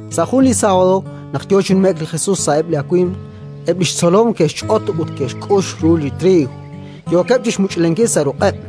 Sa' jun li sábado, naq yo chi nume'k li Jesus sa'eb' li awimq, eb' li xtzolom ke'xch'ot ut ke'xk'ux ru li triiw, yookeb' chi xmuch'lenkil sa' ruq'eb'.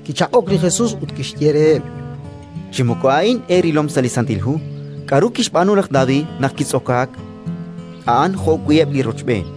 Kichaq'ok li Jesus ut kixye reheb': —Chi moko a'in eerilom sa' li Santil Hu, k'aru kixb'aanu laj David naq kitz'okaak a'an jo'wi' eb' li rochb'een,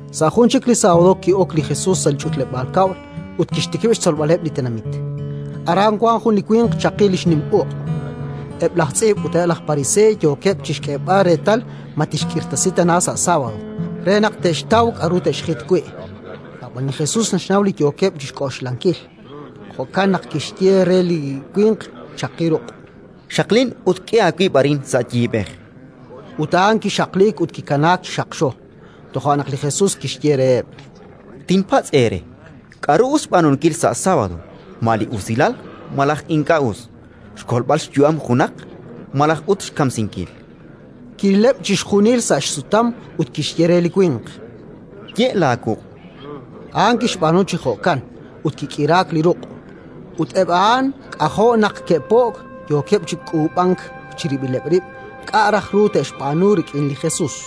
Sa' jun chik li sábado ki'ok li Jesus sa' li ch'utleb'aal kab'l ut kixtikib' xtzolb'aleb' li tenamit. Aran wank jun li winq chaqi li xnim uq'. Eb' laj tz'iib' ut eb' laj pariseey yookeb' chi xk'eeb'al reetal ma tixk'irtasi tana sa' sábado, re naq te'xtaw k'aru te'xjit wi'. Ab'an li Jesus naxnaw li yookeb' chi xk'oxlankil; jo'kan naq kixye re li winq chaqi ruq': —Xaqlin ut k'e aawib' arin sa' yiib'ej. Ut a'an kixaqliik ut kikanaak chi xaqxo. Toja' naq li Jesus kixye reheb': —Tinpatz' eere: K'aru us xb'aanunkil sa' sábado, ma li usilal malaj li ink'a' us, xkolb'al xyu'am junaq malaj ut xkamsinkil? Kirileb' chixjunil sa' xsutam ut kixye re li winq: —Ye' laawuq'. A'an kixb'aanu chi jo'kan, ut kik'iraak li ruq'. Ut eb' a'an k'ajo' naq ke'po'k, yookeb' chi k'uub'ank chirib'ileb' rib' k'a' raj ru te'xb'aanu rik'in li Jesus.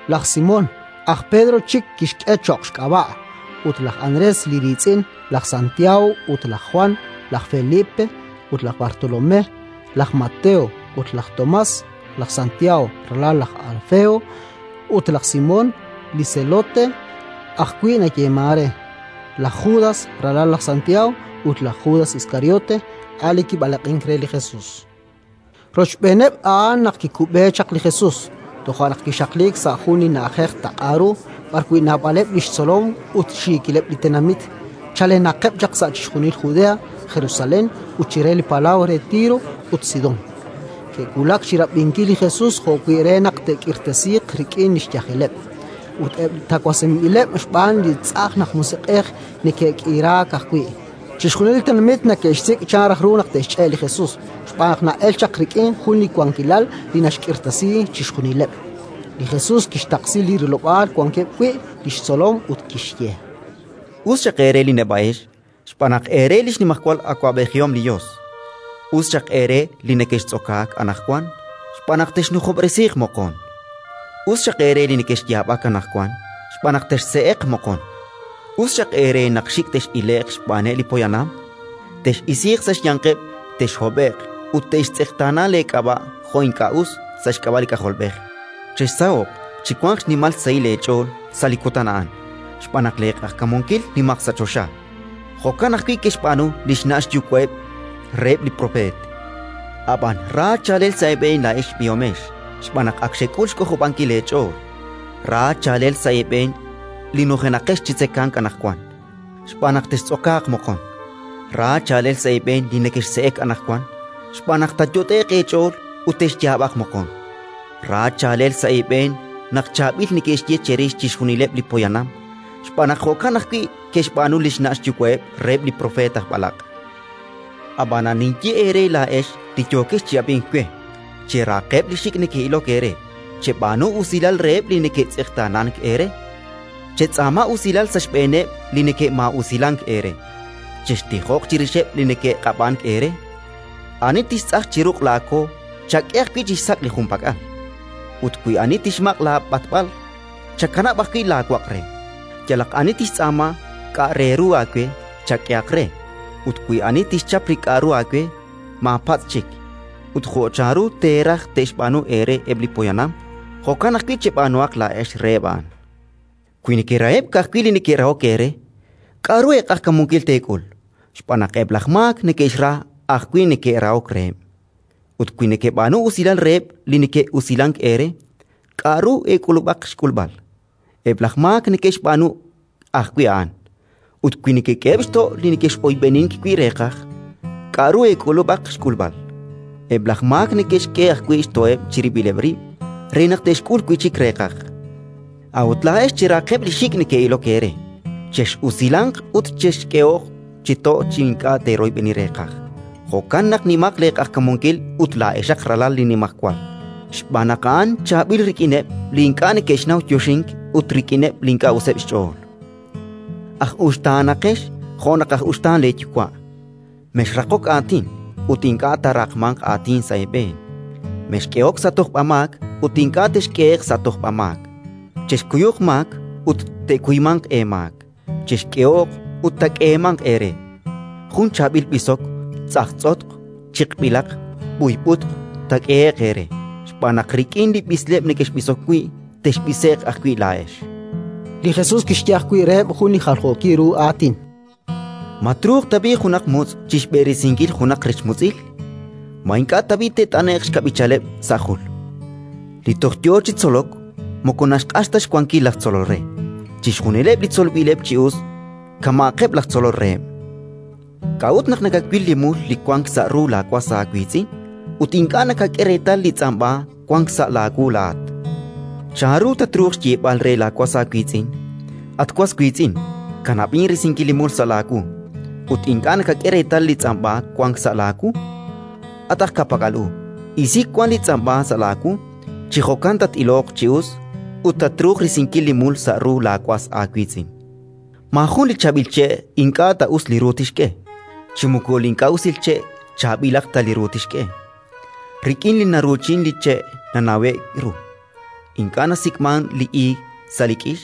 laj Simón (aj Pedro chik kixk'e cho'q xk'ab'a') ut laj Andrés li riitz'in, laj Santiago ut laj Jwan, laj Felipe ut laj Bartolomé, laj Mateo ut laj Tomás, laj Santiago, ralal laj Alfeo, ut laj Simón, li Zelote ajwi' nayeemank re, laj Judas, ralal laj Santiago, ut laj Judas Iskariote, a' li kib'alaq'ink re li Jesus. Rochb'eeneb' a'an naq kikub'e chaq li Jesus. Toja' naq kixaqliik sa' jun li na'ajej taq'a ru, b'arwi' naab'aleb' li xtzolom ut xiikileb' li tenamit chalenaqeb' chaq sa' chixjunil Judea, Jerusalén, ut chire li palaw re Tiro ut Sidón. Ke'wulak chi rab'inkil li Jesus jo'wi' re naq te'k'irtasiiq rik'in li xyajeleb'. Ut eb' li tawasinb'ileb' xb'aan li tz'ajn aj musiq'ej neke'k'iraak ajwi'. Chixjunil li tenamit neke'xsik' chan raj ru naq te'xch'e' li Jesus, xb'aan naq na'elk chaq rik'in jun li wankilal li naxk'irtasi chixjunileb'. Li Jesus kixtaqsi li rilob'aal wankeb' wi' li xtzolom ut kixye: “Us xaq eere li neb'a'ex, xb'aan naq eere li xnimajwal awab'ejihom li Yos. “Us xaq eere li nekextz'okaak anaqwan, xb'aan naq texnujob'resiiq moqon. “Us xaq eere li nekexyaab'ak anaqwan, xb'aan naq texse'eq moqon. “Us xaq eere naq xik' tex'ile'q xb'aaneb' li poyanam, tex'isiiq sa' xyanqeb', texhob'e'q ut te'xtz'eqtaana leek'ab'a' jo' ink'a' us, sa' xk'ab'a' li K'ajolb'ej. Chexsaho'q, chiwanq xnimal xsahil eech'ool sa' li kutan a'an, xb'aan naq leeq'ajkamunkil nimaq sa' choxa: jo'kan ajwi' ke'xb'aanu li xna' xyuwa'eb' reheb' li propeet. “Ab'an ra chaalel sa' eeb'een laa'ex b'ihomex, xb'aan naq ak xek'ul xk'ojob'ankil eech'ool. “Ra chaalel sa' eeb'een li nujenaqex chi tzekemq anaqwan, xb'aan naq textz'okaaq moqon. “Ra chaalel sa' eeb'een li nekexse'ek anaqwan, xb'aan naq taayot'e'q eech'ool ut texyaab'aq moqon. “Ra chaalel sa' eeb'een naq chaab'il neke'xye cherix chixjunileb' li poyanam, xb'aan naq jo'kan ajwi' ke'xb'aanu li xna' xyuwa'eb' reheb' li propeet aj b'alaq'. “Ab'anan ninye eere laa'ex li yookex chi ab'ink we: Cherahaqeb' li xik' neke'ilok eere, cheb'aanu usilal reheb' li neke'tz'eqtaanank eere. Chetz'aama usilal sa' xb'eeneb' li neke'maa'usilank eere, chextijoq chirixeb' li neke'q'ab'ank eere. Ani tixtz'aj chi ruq' laako chak'e ajwi' chixsak' li junpak'al; ut wi ani tixmaq' laab'atb'al, chakanab' ajwi' laawaq' re. Yalaq ani tixtz'aama k'a' re ru aawe, chak'ehaq re, ut wi ani tixchap li k'aru aawe, maapatz' chik. Ut jo' chanru teeraj te'xb'aanu eere eb' li poyanam, jo'kan ajwi' cheb'aanuhaq laa'ex reheb' a'an. “Wi nekeraheb' ka'ajwi' li neke'rahok eere, k'aru eeq'ajkamunkil teek'ul? Xb'aan naq eb' laj maak neke'xra ajwi' li neke'rahok reheb'. Ut wi nekeb'aanu usilal reheb' li neke'usilank eere, k'aru eek'ulub'aq xk'ulb'al? Eb' laj maak neke'xb'aanu ajwi' a'an. Ut wi nekek'eheb' xto' li nekex'oyb'enin wi' reeqaj, k'aru eek'ulub'aq xk'ulb'al? Eb' laj maak neke'xk'e ajwi' xto'eb' chirib'ileb' rib' re naq te'xk'ul wi' chik reeqaj. “A'ut laa'ex cherahaqeb' li xik' neke'ilok eere, chex'usilanq ut chexk'ehoq chi to' chi ink'a' teeroyb'eni reeqaj: jo'kan naq nimaq leeq'ajkamunkil ut laa'exaq ralal li Nimajwal, xb'aan naq A'an chaab'il rik'ineb' li ink'a' neke'xnaw yoxink ut rik'ineb' li ink'a' useb' xch'ool. “Aj uxtaanaqex jo' naq aj uxtaan leeYuwa'. “Mexraqok aatin, ut ink'a' taaraqmanq aatin sa' eeb'een. Mexk'ehok sa' tojb'amaak, ut ink'a' texk'ehe'q sa' tojb'amaak. Chexkuyuq maak, ut te'kuymanq eemaak. Chexk'ehoq, ut taak'eemanq eere: jun chaab'il b'isok, tz'ajtz'otq, chiq'b'ilaq, b'uyb'utq taak'ehe'q eere. Xb'aan naq rik'in li b'isleb' nekexb'isok wi', texb'ise'q ajwi' laa'ex”. Li Jesus kixye ajwi' reheb' jun li jaljookil ru aatin: “Ma truuq tab'i' junaq mutz' chi xb'eresinkil junaq rech mutz'il? Ma ink'a' tab'i' te't'ane'q xkab'ichaleb' sa' jul? Li toj yo chi tzolok moko naxq'ax ta xwankil laj tzolol re. Chixjunileb' li tzolb'ileb' chi us kama'aqeb' laj tzolol reheb'. “K'a'ut naq nakawil li mul li wank sa' ru laawas aawiitz'in ut ink'a' nakak'e reetal li tz'amb'a wank sa' laawu laa'at? Chanru tatruuq xyeeb'al re laawas aawiitz'in: «At was wiitz'in, kanab'in risinkil li mul sa' laawu», ut ink'a' nakak'e reetal li tz'amb'a wank sa' laawu? At aj ka'pak'al u, isi wan li tz'amb'a sa' laawu; chi jo'kan tat-iloq chi us ut tatruuq risinkil li mul sa' ru laawas aawiitz'in. Li chaab'il che' “Maajun li chaab'il che' ink'a' ta us li ru tixk'e, chi moko li ink'a' usil che' chaab'ilaq ta li ru tixk'e. Rik'in li naruuchin, li che' nanawe'k ru. Ink'a' nasik'mank li iig sa' li k'ix,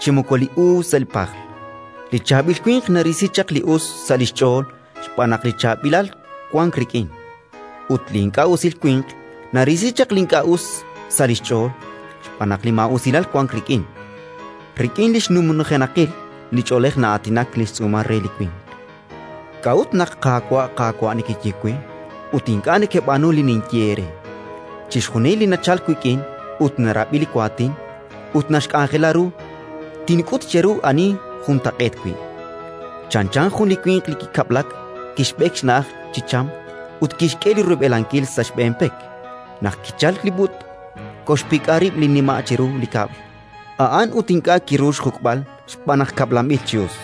chi moko li uub' sa' li pajl. Li chaab'il winq narisi chaq li us sa' li xch'ool xb'aan naq li chaab'ilal wank rik'in; ut li ink'a' usil winq narisi chaq li ink'a' us sa' li xch'ool xb'aan naq li maa'usilal wank rik'in. Rik'in li xnumnujenaqil li ch'oolej na'aatinak li xtz'uumal re li winq. “K'a'ut naq: «Qaawa', Qaawa'», nekeye we, ut ink'a' nekeb'aanu li ninye eere? Chixjunil li nachalk wik'in ut narab'i li waatin, ut naxk'anjela ru, tink'ut cheru ani juntaq'eet wi': chanchan jun winq li kikab'lak, kixb'ek xna'aj chi cham ut kixk'e li rub'elankil sa' xb'een pek. Naq kichalk li b'ut', koxpik'a rib' li nima' chiru li kab'l a'an ut ink'a' kiru xjuk'b'al xb'aan naq kab'lanb'il chi us.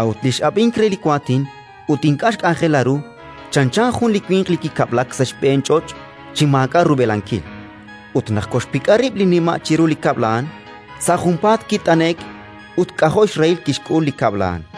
A'ut li x'ab'ink re li waatin ut ink'a' xk'anjela ru, chanchan jun winq li kikab'lak sa' xb'een ch'och' chi maak'a' rub'elankil; ut naq koxpik'a rib' li nima' chiru li kab'l a'an, sa' junpaat kit'ane'k ut k'ajo' xrahil kixk'ul li kab'l a'an”.